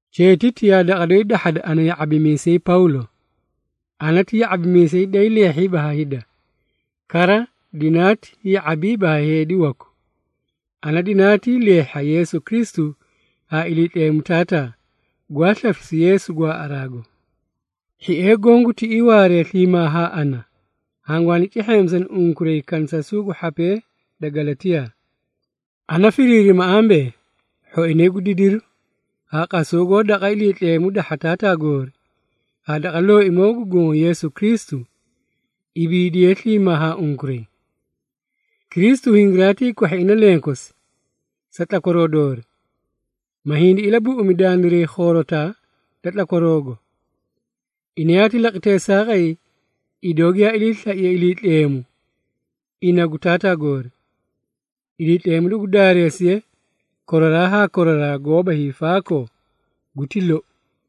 Cheetiti yaa daqa doyi dahhada ana ya⁄abimiisay Pawlo. Ana ti ya⁄abimiisay daay leehhiiba ha hida, kara dinaati ya⁄abiiba ha heedi waku. Ana dinaatii leehhi ha Yeesu Kristu haa Iliitleemu Taataa, gwaa slafisu Yeesu gwaaꞌaraago. Hhiee goõ gu tiꞌii waaree sliimaa haa ana, hangwaani cehheemisani unkuray kanisasuu gu hhapee da Galatiyaa. Ana firiirima ambee, hhoinay gu didiru haa qasaw goó daqa Iliitleemu dahha Taataa goori haa daqa Looimoo gu Goõ Yeesu Kristu, ibiidiye sliimaa haa unkuray. Kristu hingiraatii kwahhi ina lenkosi, sa tlakwaroo doori, ma hindi ilabuꞌumi dandiray khoorotaa da tlakwaroogo. Ina yaati laqi teesaaqay idoo giyaa iliislaiye Iliitleemu ina gu Taataa goori. Iliitleemu dugu daareesiye koraraa haa koraraa goóba hiifaakoo. Guti lou.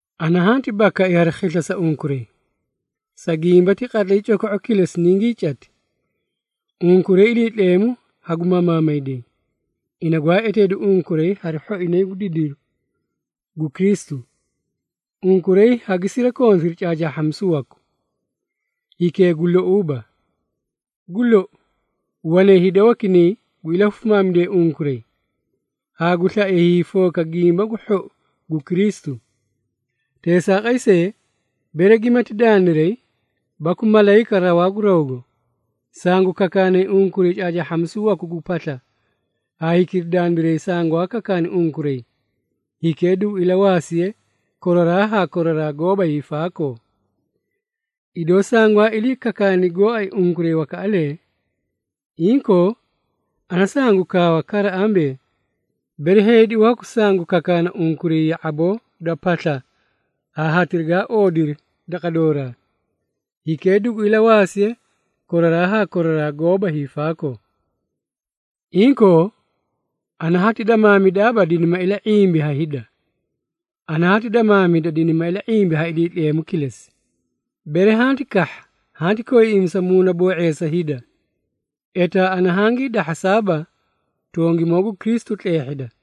Ana hanti bakai hari khisla sa unkuray, sa gimba ti qatlay coko⁄u kilesi ningii cati, unkuray Iliitleemu hagu mamaamayday, ina gwaa eteedu unkuray hari hhoinay gu didiru gu Kristu. Unkuray hagi sirakontiri caacaahhamisu waku hikee gu louuba. Gu lou, wanay hida wakinay gu ilahufimaamidee unkuray, haa gu slaee hiifooka Gimba gu Hhou gu Kristu. Teesaaqay see, bere gimati dandiray baku malayika rawaa gu rawgo, sangu kakaanay unkuray caacaahhamisu waku gu pasla haa hikira dandiray sangwaa kakaani unkuray, hikee dugu ilawaasiye koraraa haa koraraa goóba hiifaakoo! Idoo sangwaa ilii kakaani gooay unkuray wakaꞌalee, inkoo, ana sangu kaawa kara ambee, bere heedi waku sangu kakaana unkuray ya⁄aboo da pasla haa hatira gaa oodiri daqa dooraa, hikee dugu ilawaasiye koraraa haa koraraa goóba hiifaakoo! Inkoo, ana hati damaamidaaba dinima ila⁄imba ha hida. Ana hati damaamida dinima ila⁄imba ha Iliitleemu kilesi. Bere, hanti kahha hanti koiiꞌimisa muunaboo⁄eesa hida, etaa ana hangii dahhasaaba tongimoo gu Kristu tleehhida.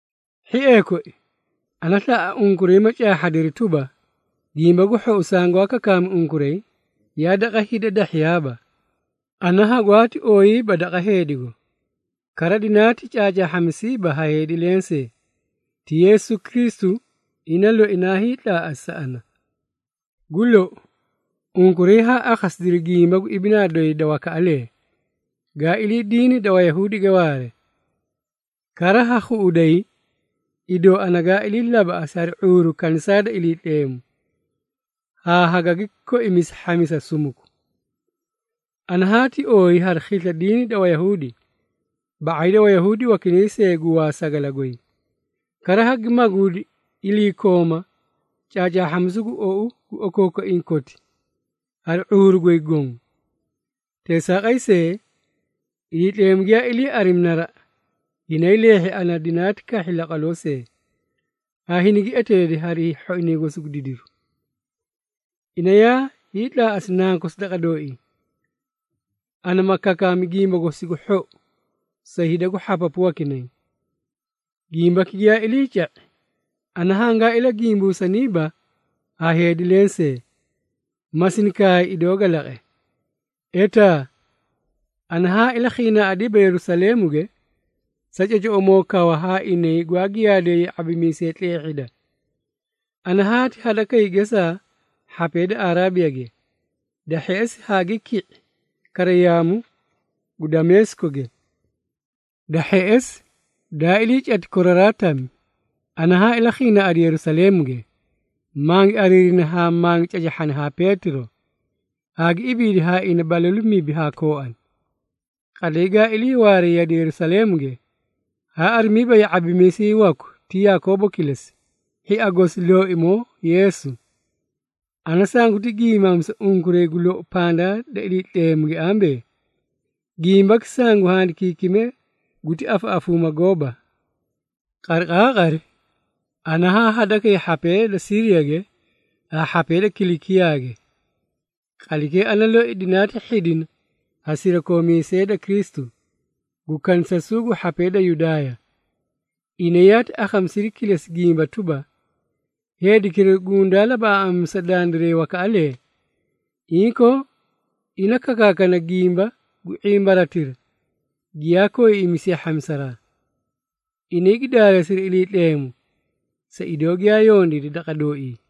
Hhiee koi, ana slaꞌa unkuray ma caahhadiri tuba, Gimba gu Hhou sangwaa kakaami unkuray, yaa daqa hida dahhiyaaba. Ana hagwaati ooyiiba daqa heedigo, kara dinaati caacaahhamisiiba ha heedi lensee. Ti Yeesu Kristu ina loi naa hiitlaaꞌasi sa ana. Gu lou, unkuray haa akhasidiri gimba gu ibinaa doyi da wakaꞌalee, gaa ilii diini da Wayahuudige waare. Kara ha khuꞌuday, idoo ana gaa ilii labaꞌasi hari ⁄uuru kanisaa da Iliitleemu, haa hagagi koimisi hhamisa sumuku. Ana haati ooyi hari khisla diini da Wayahuudi, ba⁄ay da Wayahuudi wakinay see gu waasagala goy. Kara hagi maguudi iliikooma caacaahhamisu gu ou gu okookoiĩ koti, hari ⁄uuru goy goõ. Teesaaqay see, Iliitleemu giyaa ilii arimi naraꞌa, hinaay leehhi ana dinaati kahhi laqwaloo see, haa hinigi eteedi hari hhoinay gosi gu didiru. Ina yaa hiitlaaꞌasi Nankosi daqa dooii, ana ma kakaami Gimba gosi gu Hhou sa hida gu hhapapu wakinay. Gimbaki giyaa iliica⁄i, ana hangaa ilagimbusaniiba haa heedi lensee, ma sini kaay idoo ga laqe. Etaa, ana haa ilakhiinaaꞌadiiba Yerusaleemuge, sa cocoꞌomoo kawa haa inay gwaa giyaadee ya⁄abimiisee tleehhida. Ana haati hadakay gesaa hhapee da Araabiyage, da hheꞌesi haagi ki⁄i kara yaamu gu Dameesikoge. Da hheꞌesi, daa ilii cati koraraa tami, ana haa ilakhiinaaꞌadi Yerusaleemuge, mangi ariirini haa mangi cacahhani haa Peetiro, haa gi ibiidi haa ina balalu mibi haa kooani. Qatlay gaa iliiwaare yade Yerusaleemuge, haa arimiiba ya⁄abimiisay waku ti Yakoobo kilesi, hhia gosi Looimoo Yeesu. Ana sanguti giimaamisa unkuray gu lou pandaa da Iliitleemuge ambee, gimbaki sangu handikiikime guti afaꞌafuuma gooba. Qariqaaqari ana haa hadakay hhapee da Siiriyage haa hhapee da Kilikiyaage. Qatlaykee ana loi dinaati hhidina ha sirakoomiisee da Kristu, gu kanisasuu gu hhapee da Yudaaya. Inay yaati akhamisiri kilesi gimba tuba, “Heedikira gundaa labaꞌaaꞌamisa dandiray wakaꞌalee, inkoo, ina kakaakana gimba gu ⁄imbaratira, giyaa koiiꞌimisiye hhamisaraa.” Inay gi daareesiri Iliitleemu, sa idoo giyaa yondiidi daqa dooii.